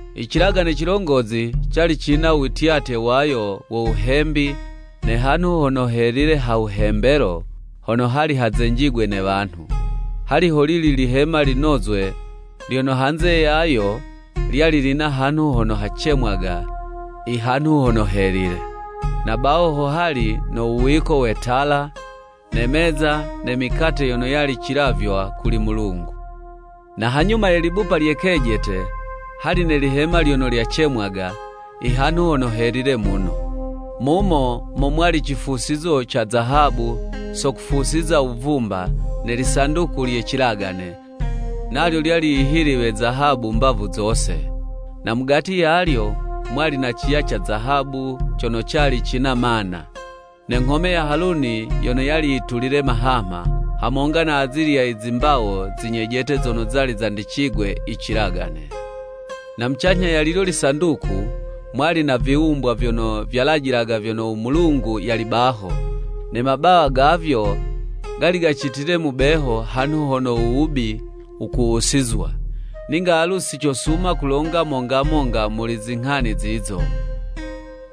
I cilagane cilongozi cali cina u wityatye wayo wo wuhembi ne hanhu hono helile ha wuhembelo, hono hali hazenjigwe ne wanhu. Hali holili lihema linozwe, lyono hanze yayo lyali lina hanhu hono hacemwaga i “Hanhu Hono Helile.” Na baho ho hali no wuwiko we tala, ne meza ne mikate yono yali cilavywa kuli Mulungu. Na hanyuma ye libupa lye kejete, hali ne lihema lyono lyacemwaga i “Hanhu Hono Helile muno.” Mumo mo mwali cifusizo ca zahabu so kufusiza wuvumba ne lisanduku lye cilagane, nalyo lyali yihiliwe zahabu mbavu zose, na mugati yalyo, mwali na ciya ca zahabu cono cali cina mana, ne nghome ya Haluni yono yali yitulile mahamha, hamonga na azilya i zimbawo zi nyejete zono zali zandicigwe i cilagane. Na mucanyha ya lilyo lisanduku, mwali na viwumbwa vyono vyalajilaga vyono u Mulungu yali baho, ne mabawa gavyo gali gacitile mubeho hanhu hono u wubi wukuwusizwa. Ninga alu si cosuma kulonga monga monga muli zinghani zizo.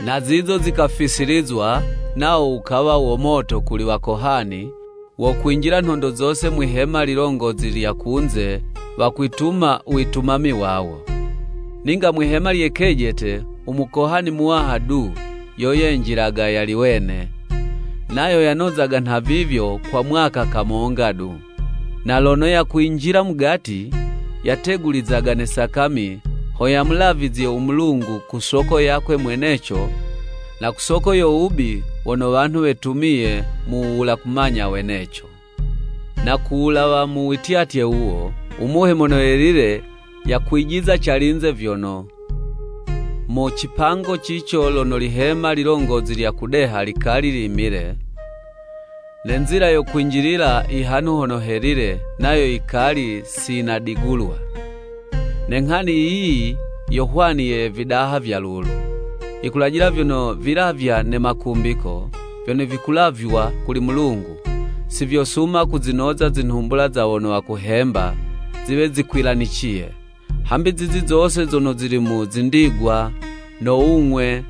I mipango yiyo yikafisilizwa, nawo wukawa wo moto kuli wakohani, wo kwinjila nhondo zose mwihema lilongozi lya kunze wakwituma u witumami wawo. Ninga mwihema lye kejete, u Mukohani Muwaha du, yo yenjilaga yali wene, nayo yanozaga nhavivyo kwa mwaka kamonga du. Na lono yakwinjila mugati, yategulizaga ne sakami ho yamulavizye u Mulungu ku soko yakwe mweneco na ku soko yo wubi wono wanhu wetumiye mu wuwula kumanya weneco. Na ku wulawa mu wityatye wuwo, u Muhe Mono Yelile yakwijiza calinze vyono, mu cipango cico lono lihema lilongozi lya kudeha likali limile, ne nzila yo kwinjilila i Hanhu Hono Helile nayo yikali si yinadigulwa. Ne nghani yiyi yo hwani ye vidaha vya lulu. Yikulajila vyono vilavywa ne makumbiko, vyono vikulavywa kuli Mulungu, si vyosuma kuzinoza zinhumbula za wono wakuhemba, ziwe zikwilaniciye, hambi zizi zose zono zili mu zindigwa, no wung'we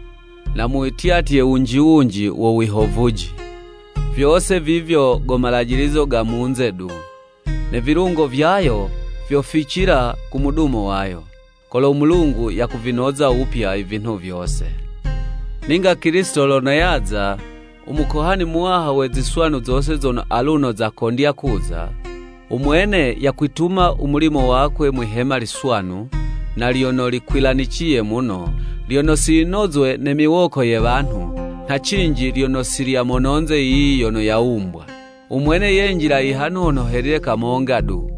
na mu wityatye wunji wunji wo wihovuji. Vyose vivyo go malajilizo ga munze du; ne vilungo vyayo vyoficila ku mudumo wayo, kolo u Mulungu yakuvinoza wupya i vinhu vyose. Ninga Kilisito lono yaza, u Mukohani Muwaha we ziswanu zose zono aluno zakondya kuza. U Mwene yakwituma u mulimo wakwe mwihema liswanu, na lyono likwilaniciye muno, lyono si yinozwe ne miwoko ye wanhu, nha cinji lyono si lya mononze yiyi yono yawumbwa. U Mwene yenjila i Hanhu Hono Helile kamonga du,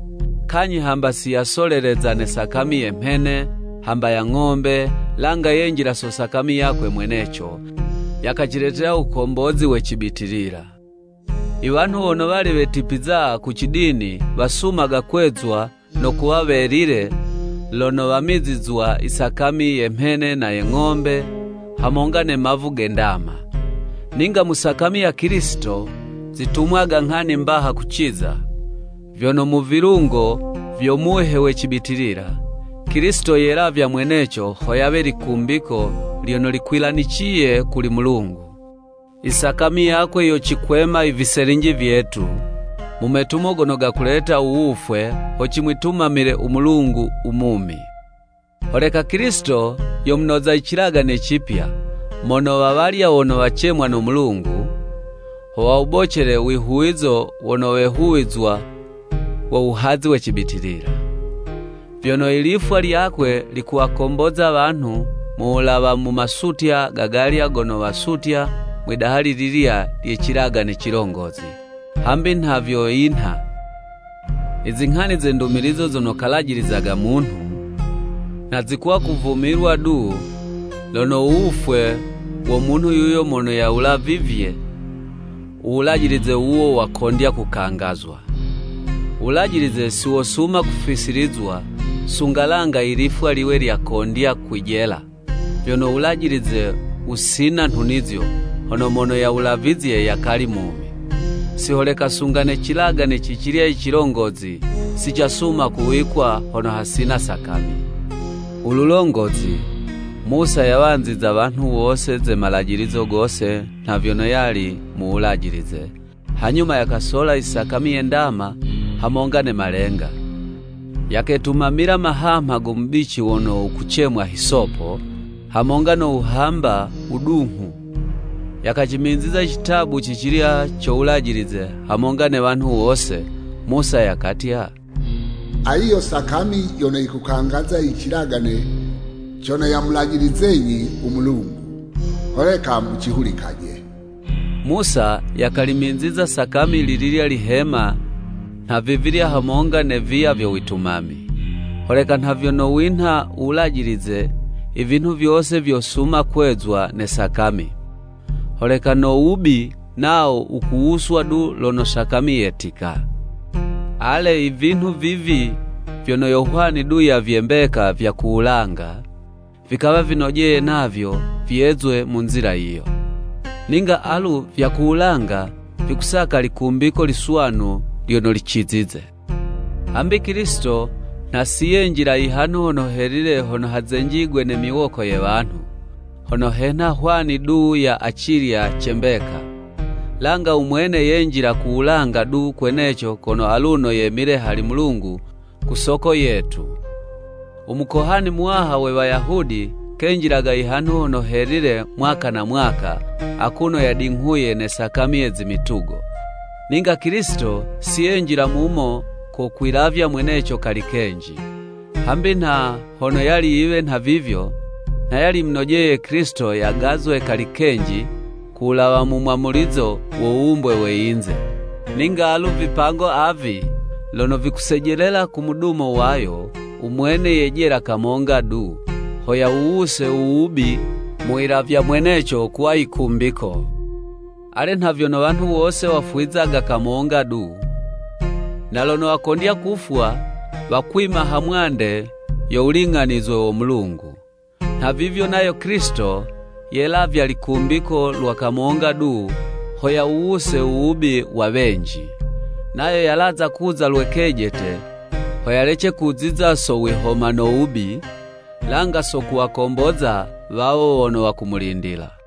kanyhi hamba si yasoleleza ne sakami ye mhene, hamba ya ng'ombe, langa yenjila so sakami yakwe mweneco, yakaciletela u wukombozi we cibitilila. I wanhu wono wali wetipiza ku ci dini wasumaga kwezwa no kuwa welile, lono wamizizwa i sakami ye mhene na ye ng'ombe, hamonga ne mavu ge ndama. Ninga mu sakami ya Kilisito zitumwaga nghani mbaha kuciza! Vyono mu vilungo vyo Muhe we cibitilila, Kilisito yelavya mweneco ho yawe likumbiko lyono likwilaniciye kuli Mulungu. I sakami yakwe yocikwema i viselinji vyetu mu metumo gono gakuleta u wufwe, ho cimwitumamile u Mulungu u mumi. Holeka Kilisito yo munoza i cilagane cipya mono wa walya wono wacemwa no Mulungu, ho wawubocele wihuwizo wono wehuwizwa wo wuhazi we cibitilila. Vyono i lifwa lyakwe likuwakomboza wanhu mu wulawa mu masutya ga galya gono wasutya mwidaha li lilya lye cilagane cilongozi. Hambi nha vyo yinha, i zinghani ze ndumilizo zono kalajilizaga munhu, nha zikuwa kuvumilwa du lono u wufwe wo munhu yuyo mono yawulavivye u wulajilize wuwo wakondya kukangazwa. U wulajilize si wosuma kufisilizwa, sunga langa i lifwa liwe lyakondya kwijela, vyono u wulajilize wusina nhunizo, hono mono yawulavizye yakali mumi. Si holeka sunga ne cilagane cicilya i cilongozi, si casuma kuwikwa hono hasina sakami. U lulongozi, Musa yawanziza wanhu wose ze malajilizo gose nha vyono yali mu Wulajilize, hanyuma yakasola i sakami ye ndama hamonga ne malenga, yaketumamila mahamha go mubici wono wukucemwa hisopo, hamonga no wuhamba wudunghu, yakacimiziza i citabu cicilya co Wulajilize hamonga ne wanhu wose. Musa yakatya, “Ayi yo sakami yono yikukangaza i cilagane cono yamulajilizenyi u Mulungu, holeka mucihulikaje.” Musa yakalimiziza sakami lililya lihema nhavivilya hamonga ne viya vyo witumami. Holeka nha vyono winha u Wulajilize, i vinhu vyose vyosuma kwezwa ne sakami, holeka no wubi nawo wukuwuswa du lono sakami yetika. Ale, i vinhu vivi vyono yo hwani du ya vye mbeka vya ku wulanga, vikawa vinojeye navyo vyezwe mu nzila yiyo. Ninga alu vya ku wulanga vikusaka likumbiko liswanu lyono licizize. Hambi Kilisito nha si yenjila i hanhu Hono Helile hono hazenjigwe ne miwoko ye wanhu, hono henha hwani du ya acilya ce mbeka. Langa u Mwene yenjila ku wulanga du kweneco kono aluno yemile hali u Mulungu ku soko yetu. U Mukohani Muwaha we Wayahudi kenjilaga i Hanhu Hono Helile mwaka na mwaka akuno yadinghuye ne sakami ye zi mitugo; ninga Kilisito si yenjila mumo ko kwilavya mweneco kali kenji, hambi nha hono yali yiwe nhavivyo, nha yali yimunojele Kilisito yagazwe kali kenji ku wulawa mu mwamulizo wo wuwumbwe we yinze. Ninga alu vipango avi lono vikusejelela ku mudumo wayo, u mwene yejela kamonga du, ho yawuwuse u wubi mu wilavya mweneco kuwa yikumbiko. Ale nha vyono wanhu wose wafwizaga kamonga du, na lono wakondya kufwa wakwima ha mwande yo wuling'anizwe wo Mulungu, nhavivyo nayo Kilisito, yelavya likumbiko lwa kamonga du ho yawuwuse u wubi wa wenji. Nayo yalaza kuza lwe kejete, ho yalece kuziza so wihoma no wubi, langa so kuwakomboza wawo wono wakumulindila.